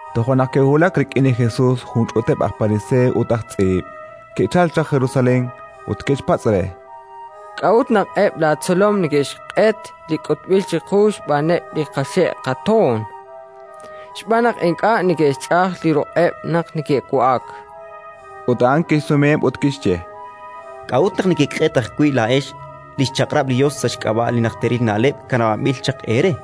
Toja' naq ke'wulak rik'in li Jesus jun ch'uuteb' aj Pariseey ut aj tz'iib', ke'chalk chaq Jerusalén, ut ke'xpatz' re: —K'a'ut naq eb' laatzolom neke'xq'et li k'utb'il chiqu xb'aaneb' li qaxe' qatoon? Xb'aan naq ink'a' neke'xch'aj li ruq'eb' naq neke'wa'ak. Ut a'an kixsumeheb' ut kixye: —K'a'ut naq nekeq'et ajwi' laa'ex li xchaq'rab' li Yos sa' xk'ab'a' li najteril na'leb' kanab'anb'il chaq eere?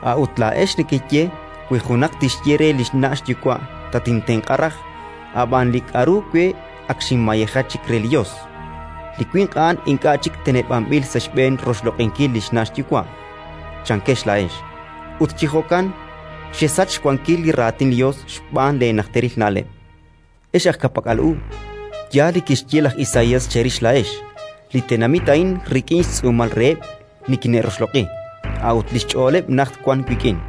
A'ut laa'ex nekeye: «Wi junaq tixye re li xna' xyuwa': Tatintenq'a raj, ab'an li k'aru we ak xinmayeja chik re li Yos, li winq a'an ink'a' chik teneb'anb'il sa' xb'een roxloq'inkil li xna' xyuwa'», chankex laa'ex. Ut chi jo'kan xesach xwankil li Raatin li Yos xb'aan leenajteril na'leb'. Ex aj ka'pak'al u, yaal li kixye laj Isaías cherix laa'ex: «Li tenamit a'in rik'in xtz'uumal reheb' nikine'roxloq'i, a'ut li xch'ooleb' najt wank wik'in.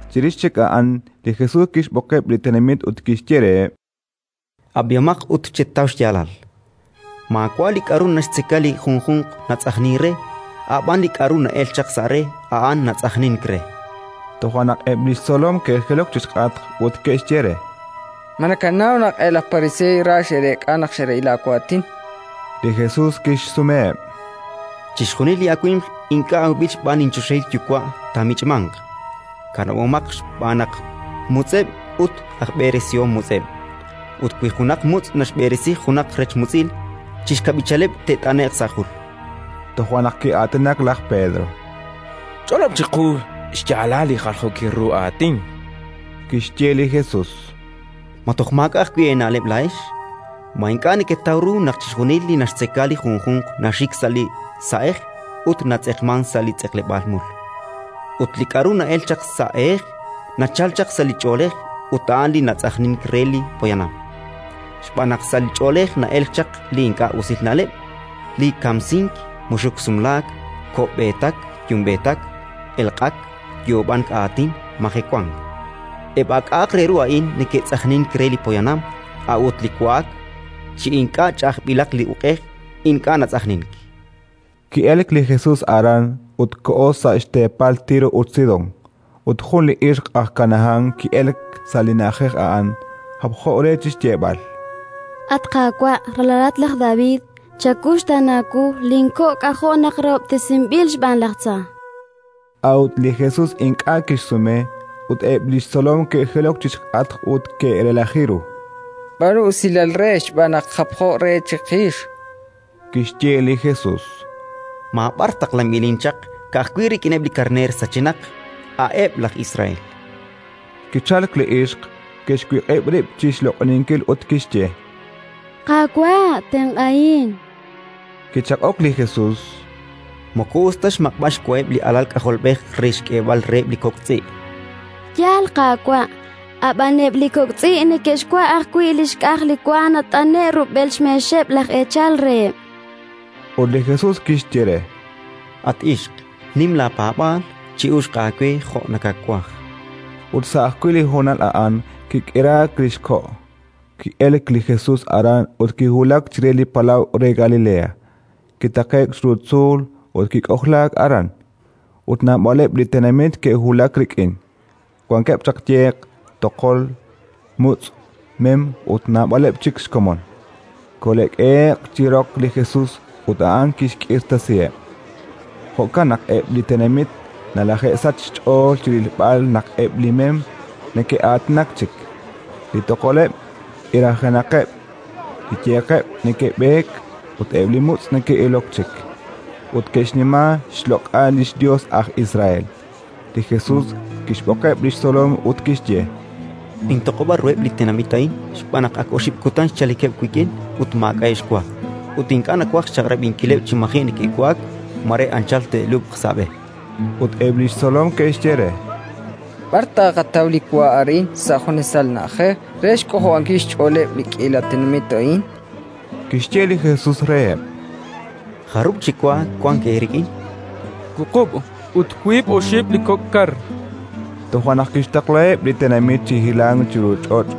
Chirix chik a'an li Jesus kixb'oqeb' li tenamit ut kixye reheb': —Ab'ihomaq ut chetaw xyaalal. Maawa' li k'aru naxtzeka li junjunq natz'ajnink re, a' b'an li k'aru na'elk chaq sa' re: a'an natz'ajnink re. Toja' naq eb' li xtzolom ke'jilok chi xk'atq ut ke'xye re: —Ma nakanaw naq eb' laj Pariseey ra xe'reek'a naq xe'rab'i laawaatin? Li Jesus kixsumeheb': —Chixjunil li awimq ink'a' awb'il xb'aan linchoxahil Yuwa' taamich'manq. Kanab'omaqeb' xb'aan naq mutz'eb' ut aj b'eresihom mutz'eb'. Ut wi junaq mutz' naxb'eresi junaq rech mutz'il, chi xkab'ichaleb' te't'ane'q sa' jul. Toja' naq ki'aatinak laj Pedro: —Ch'olob' chiqu xyaalal li jaljookil ru aatin, chan re. Kixye li Jesus: —Ma toj maak'a' ajwi' eena'leb' laa'ex? Ma ink'a' neketaw ru naq chixjunil li naxtzeka li junjunq naxik sa' li sa'ej ut natz'eqmank sa' li tz'eqleb'aal mul? Ut li k'aru na'elk chaq sa' ehej, nachalk chaq sa' li ch'oolej, ut a'an li natz'ajnink re li poyanam. Xb'aan naq sa' li ch'oolej na'elk chaq li ink'a' usil na'leb': li kamsink, muxuk sumlaak, ko'b'eetak yumb'eetak, elq'ak, yoob'ank aatin, majewank. Eb' a k'a' re ru a'in neke'tz'ajnink re li poyanam; a'ut li wa'ak chi ink'a' ch'ajb'ilaq li uq'ej, ink'a' natz'ajnink. Ki'elk li Jesus aran ut koho sa' xteepal Tiro ut Sidón. Ut jun li ixq aj Kanahán ki'elk sa' li na'ajej a'an, japjo re chi xyeeb'al: —At Qaawa', ralalat laj David, chawuxtaana wu! Linko' k'ajo' naq rahob'tesinb'il xb'aan laj tza! A'ut li Jesus ink'a' kixsume. Ut eb' li xtzolom ke'jilok chi xk'atq ut ke'relaji ru: —B'aanu usilal re, xb'aan naq japjo re chiqix, chankeb'. Kixye li Jesus: —Maab'ar taqlanb'ilin chaq, ka'ajwi' rik'ineb' li karneer sachenaq, a'eb' laj Israel. Kichalk li ixq, kixwiq'ib' rib' chi xloq'oninkil ut kixye: —Qaawa', tenq'ahin! Kichaq'ok li Jesus: —Moko us ta xmaq'b'al xwaheb' li alal k'ajolb'ej re xk'eeb'al reheb' li kok' tz'i', chan re. —Yaal, Qaawa' -chan li ixq-, ab'an eb' li kok' tz'i' neke'xwa' ajwi' li xk'aj li wa nat'ane'k rub'el xmeexeb' laj eechal reheb'. Ut li Jesus kixye re: —At ixq, nim laapaab'aal; chi'uxq aawe jo' nakawaj. Ut sa' ajwi' li honal a'an kik'iraak li xko'. Ki'elk li Jesus aran ut kiwulak chire li palaw re Galilea; kitaqe'k chiru tzuul ut kik'ojlaak aran. Ut naab'aleb' li tenamit ke'wulak rik'in: wankeb' chaq yeq, toqol, mutz', mem ut naab'aleb' chik xkomon. Kole'k'ehe'q chi roq li Jesus ut a'an kixk'irtasiheb'. Jo'kan naq eb' li tenamit nalaje'sachk xch'ool chi rilb'al naq eb' li mem neke'aatinak chik, li toqoleb' k'irajenaqeb', li yeqeb' neke'b'eek ut eb' li mutz' neke'ilok chik. Ut ke'xnima xloq'al li xYos aj Israel. Li Jesus kixb'oqeb' li xtzolom ut kixye: —Nintoq'ob'a ruheb' li tenamit a'in, xb'aan naq ak oxib' kutan xchalikeb' wik'in ut maak'a'eb' xwa; ut ink'a' nawaj xchaq'rab'inkileb' chi maji' neke'wa'ak: mare anchal te'lub'q sa' b'e. Ut eb' li xtzolom ke'xye re: —B'ar taaqataw li wa arin, sa' junesal na'ajej, re xk'ojob'ankil xch'ooleb' li k'iila tenamit a'in? Kixye li Jesus reheb': —Jarub' chi wa wank eerik'in? —Wuqub', ut wiib' oxib' li kok' kar, chankeb'. Toja' naq kixtaqlaheb' li tenamit chi hilank chiru ch'och',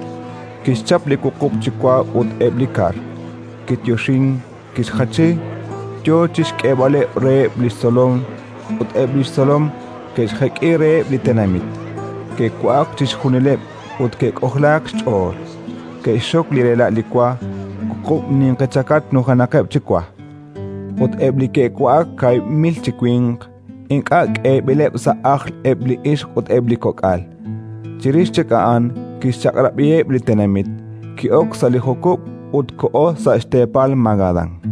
kixchap li wuqub' chi wa ut eb' li kar, kiyoxink, kixjachi, yo chi xk'eeb'al reheb' li xtzolom ut eb' li xtzolom ke'xjek'i reheb' li tenamit. Ke'wa'ak chixjunileb' ut ke'k'ojlaak xch'ool; ke'xxok li rela' li wa: wuqub' ninqi chakach nujenaqeb' chi wa. Ut eb' li ke'wa'ak kaahib' mil chi winq, ink'a' k'eeb'ileb' sa' ajl eb' li ixq ut eb' li kok'al. Chirix chik a'an kixchaq'rab'iheb' li tenamit, ki'ok sa' li jukub' ut koho sa' xteepal Magadán.